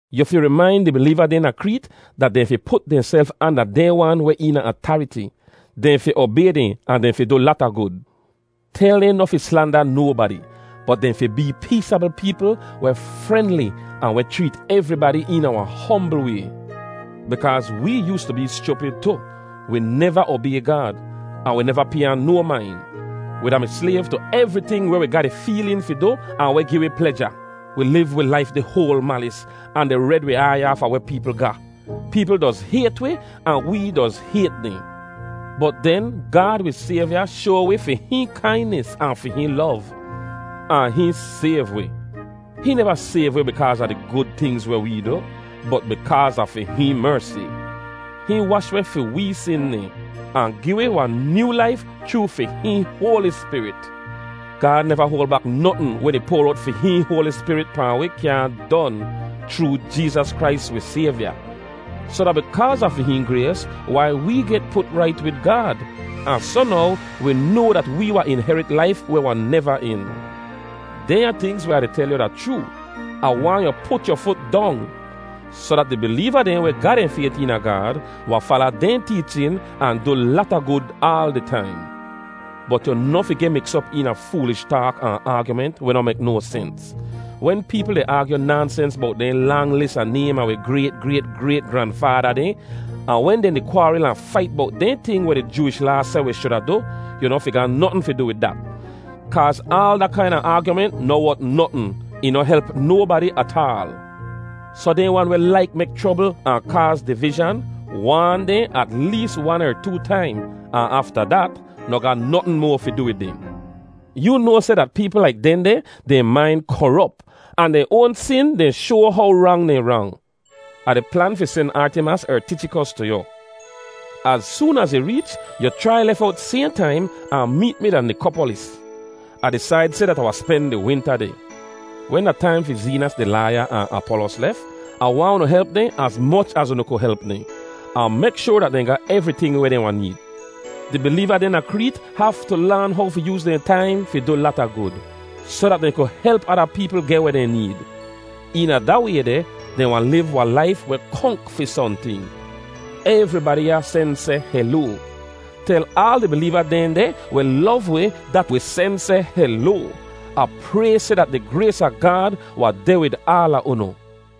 Yu fi rimain di bileeva dehn da Kreet dat dehn fi put dehnself anda dehn wan weh eena atariti. Dehn fi obay dehn ahn dehn fi du lata gud. Tel dehn noh fi slanda nobadi, bot dehn fi bee peesabl peepl weh frenli ahn weh chreet evribadi eena wahn hombl way. Bikaaz wee yoostu bee schupid tu; wi neva obay Gaad, ahn wi neva pay ahn no main. Wi da-mi slayv tu evriting weh wi ga di feelin fi du ahn weh gi wi pleja. Wi liv wi laif di hoal malis ahn di red wi aiy aafa weh peepl ga. Peepl doz hayt wi ahn wee doz hayt dehn. Bot den Gaad wi Sayvya shoa wi fi hihn kainis ahn fi hihn lov, ahn hihn sayv wi. Hihn neva sayv wi bikaaz a di gud tingz weh wee du, bot bikaaz a fi hihn mersi. Hihn wash weh fi wee sin dehn, ahn gi wi wahn nyoo laif chroo fi hihn Hoali Spirit. Gaad neva hoal bak notn wen ih poar owt fi hihn Hoali Spirit pahn wi kyaahn don, chroo Jeezas Krais wi Sayvya. Soh da bikaaz a fi hihn grays wai wee get put rait wid Gaad, ahn soh now wi noa dat wee wahn inherit laif weh wahn neva en. Dehnya tingz weh Ah di tel yu da chroo. Ah waahn yu put yu fut dong, soh dat di bileeva dehn weh ga dehn fayt eena Gaad, wahn fala dehn teechin, ahn du lata gud aal di taim. Bot yu noh fi geh miks op eena foolish taak ahn aagyument weh noh mek no sens. Wen peepl di aagyu naansens bowt dehn lang lis a naym a wi grayt, grayt, grayt granfaada dehn, ahn wen dehn di kwaaril ahn fait bowt dehn ting weh di Jooish Laa seh wi shuda du, yu noh fi ga notn fi du wid dat. Kaaz aal da kaina aagyument noh wot notn. Ih noh help nobadi ataal. Soh dehn wan weh laik mek chrobl ahn kaaz divizhan, waan dehn at lees wan er too taim, ahn afta dat, noh ga notn moa fi du wid dehn. Yoo noa seh dat peepl laik dehndeh, dehn main korop, ahn dehn oan sin dehn shoa how rang dehn rang. Ah di plan fi sen Artimas er Tichikos tu yu. Az soon az ih reech, yu chrai lef owt sayhn taim ahn meet mi da Nikopolis. Ah disaid seh dat Ah wahn spen di winta deh. Wen da taim fi Zeenas di laaya ahn Apolos lef, Ah waahn unu help dehn az moch az unu ku help dehn, ahn mek shoar dat dehn ga evriting weh dehn wahn need. Di bileeva dehn da Kreet haftu laan how fi yooz dehn taim fi du lata gud, soh dat dehn ku help ada peepl geh weh dehn need. Eena da way deh, dehn wahn liv wahn laif weh konk fi sohnting. Evribadi ya sen seh heloa. Tel aal di bileeva dehn deh weh lov wi dat wi sen seh heloa. Ah pray seh dat di grays a Gaad wahn deh wid aala unu.